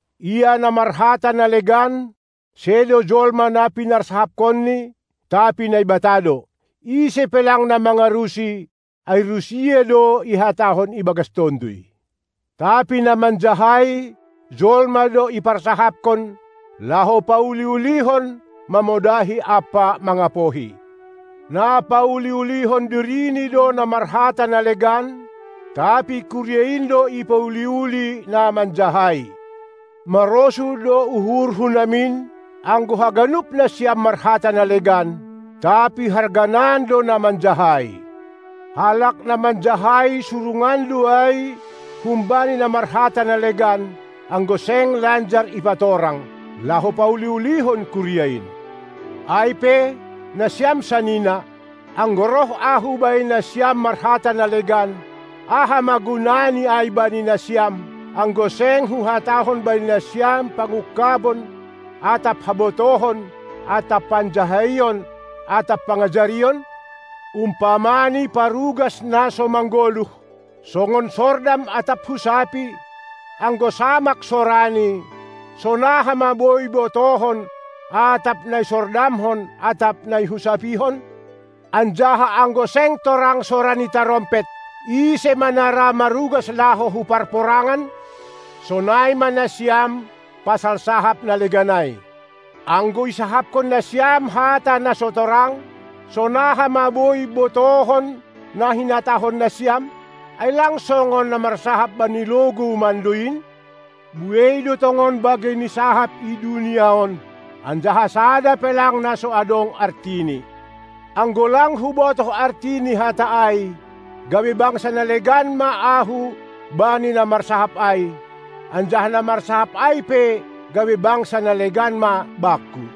Ia na marhata na legan, sedo jolma na pinarsahapkonni, tapi Naibata do. Ise pe lang na mangarusi, ai rusia do ihatahon ibagas tonduy. Tapi na manjahai, jolma do iparsahapkon, laho pauli-ulihon, mamodahi ampa mangapohi. Na pauli-ulihon dirini do na marhata na legan, tapi kuria in do ipauli-uli na manjahai. Marosuh do uhurhu namin, anggo haganup nasiam marhata na legan, tapi harganan do na manjahai. Halak na manjahai surungan do ai humbani na marhata na legan, anggo seng lanjar ipatorang, laho pauli-ulihon kuria in. Ai pe, nasiam sanina, anggo roh ahu bani nasiam marhata na legan, aha ma gunani ai bani nasiam, anggo seng huhatahon bani nasiam pangungkabon atap habotohon atap panjahaion atap pangajarion? Umpamani parugas na so manggoluh, songon sordam atap husapi, anggo samak sorani, sonaha ma boi botohon atap na isordamhon atap na ihusapihon? Anjaha anggo seng torang sora ni tarompet, ise ma na ra marugas laho hu parporangan? Sonai ma nasiam pasal sahap na legan ai. Anggo isahapkon nasiam hata na so torang, sonaha ma boi botohon na hinatahon nasiam? Ai lang songon na marsahap bani logou mando in? Buei do tongon bagei ni sahap i dunia on, anjaha sada pe lang na so adong artini. Anggo lang hubotoh arti ni hata ai, gabe bangsa na legan ma ahu bani na marsahap ai, anjaha na marsahap ai pe gabe bangsa na legan ma bakku.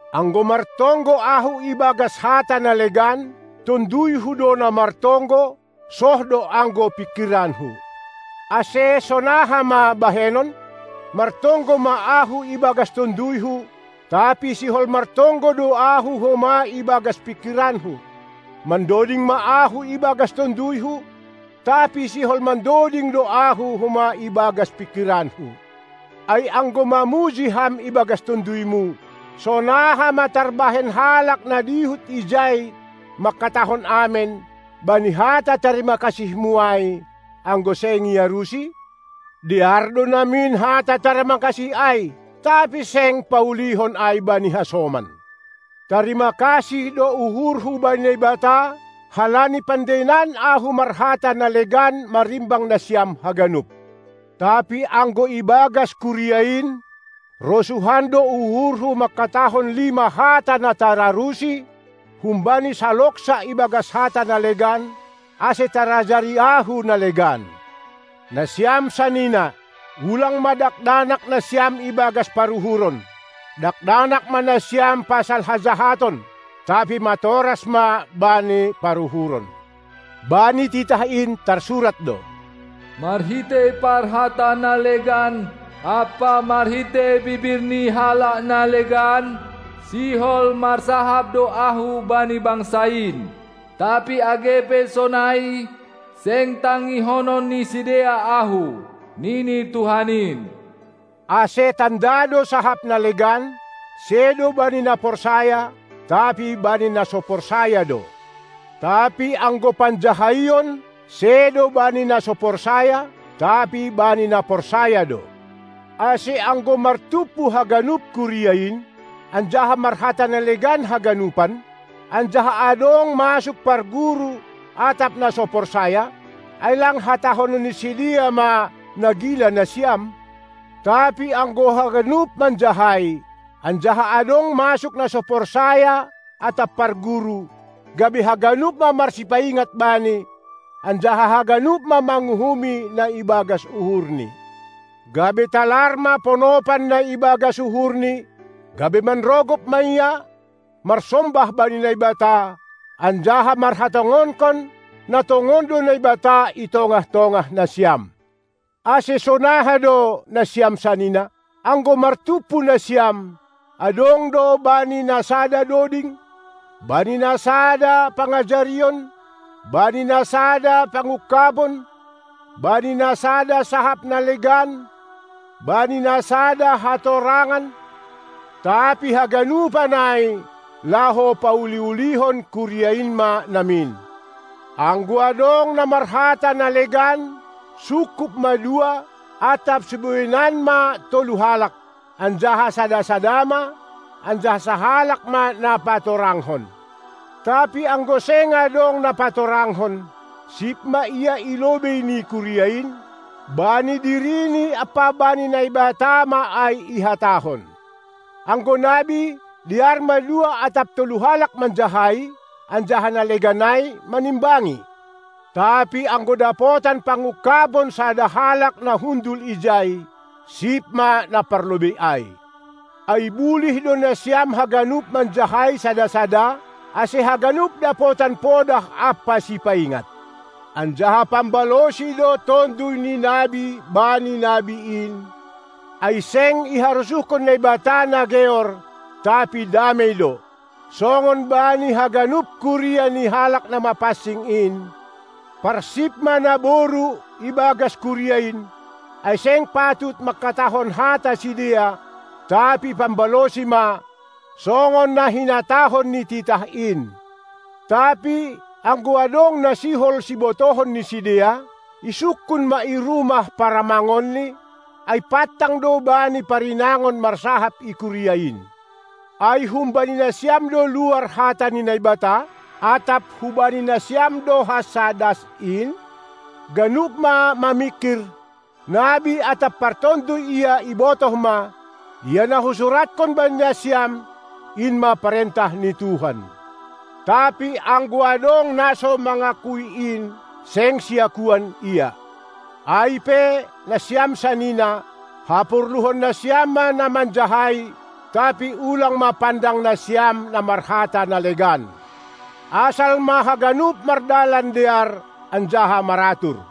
Anggo martonggo ahu ibagas hata na legan, tonduyhu do na martonggo soh do anggo pingkiranku. Ase sonaha ma bahenon? Martonggo ma ahu ibagas tonduyhu, tapi sihol martonggo do ahu homa ibagas pingkiranku. Mandoding ma ahu ibagas tonduyhu, tapi sihol mandoding do ahu homa ibagas pingkiranku. Ai anggo mamuji ham ibagas tonduymu, sonaha ma tarbahen halak na dihut ijai mangkatahon amen bani hata tarimakasihmu ai, anggo seng iarusi? Dear do namin hata tarima kasih ai, tapi seng paulihon ai bani hasoman. Tarima kasih do uhurhu bani Naibata, halani pandeinan ahu marhata na legan marimbang nasiam haganup. Tapi anggo ibagas kuria in, rosuhan do uhurhu mangkatahon lima hata na tararusi humbani saloksa ibagas hata na legan, ase tarajari ahu na legan. Nasiam sanina, ulang ma dakdanak nasiam ibagas paruhuron, dakdanak ma nasiam pasal hajahaton, tapi matoras ma bani paruhuron. Bani titah in tarsurat do: Marhitei parhata na legan ampa marhitei bibir ni halak na legan sihol marsahap do ahu bani bangsa in, tapi age pe sonai, seng tangihonon ni sidea Ahu, nini Tuhan in. Ase tanda do sahap na legan, sedo bani na porsaya, tapi bani na so porsaya do; tapi anggo panjahaion sedo bani na so porsaya, tapi bani na porsaya do. Ase anggo martumpu haganup kuria in, anjaha marhata na legan haganupan, anjaha adong masuk parguru atap na so porsaya, ai lang hatahonon ni sidea ma na gila nasiam? Tapi anggo haganup manjahai, anjaha adong masuk na so porsaya atap parguru, gabe haganup ma marsipaingat bani, anjaha haganup ma manguhumi na ibagas uhurni, gabe talar ma ponopan na ibagas uhurni, gabe manrogop ma ia, marsombah bani Naibata, anjaha marhatongonkon, na tongon do Naibata i tongah-tongah nasiam. Ase sonaha do, nasiam sanina? Anggo martumpu nasiam, adong do bani na sada doding, bani na sada pangajarion, bani na sada pangungkabon, bani na sada sahap na legan, bani na sada hatorangan. Tapi haganupan ai laho pauli-ulihon kuria in ma namin. Anggo adong na marhata na legan, sungkup ma dua atap sibueinan ma tolu halak, anjaha sada-sada ma, anjaha sahalak ma na patorangkon. Tapi anggo seng adong na patorangkon, sip ma ia i lobei ni kuria in; bani dirini ampa bani Naibata ma ai ihatahon. Anggo nabi, dear ma dua atap tolu halak manjahai, anjaha na legan ai manimbangi. Tapi anggo dapotan pangungkabon sada halak na hundul ijai, sip ma na parlobei ai. Ai bulih do nasiam haganup manjahai sada-sada, ase haganup dapotan podah ampa sipaingat; anjaha pambalosi do tonduy ni nabi bani nabi in, ai seng iharosuhkon Naibata na geor, tapi damei do. Songon bani haganup kuria ni halak na mapansing in, parsip ma naboru ibagas kuria in; ai seng patut mangkatahon hata sidea, tapi pambalosi ma, songon na hinatahon ni titah in. Tapi anggo adong na sihol sibotohon ni sidea, isungkun ma i rumah paramangonni, ai pantang do bani parinangon marsahap i kuria in. Ai humbani nasiam do luar hata ni Naibata? Atap hubani nasiam do hansa das in? Ganup ma mamingkir, nabi atap partonduy ia ibotoh ma, ia na husuratkon bani nasiam, in ma parentah ni Tuhan. Tapi anggo adong na mangakui in, seng siakuan ia! Ai pe, nasiam sanina, haporluhon nasiam ma na manjahai, tapi ulang ma pandang nasiam na marhata na legan. Asal ma haganup mardalan dear anjaha maratur.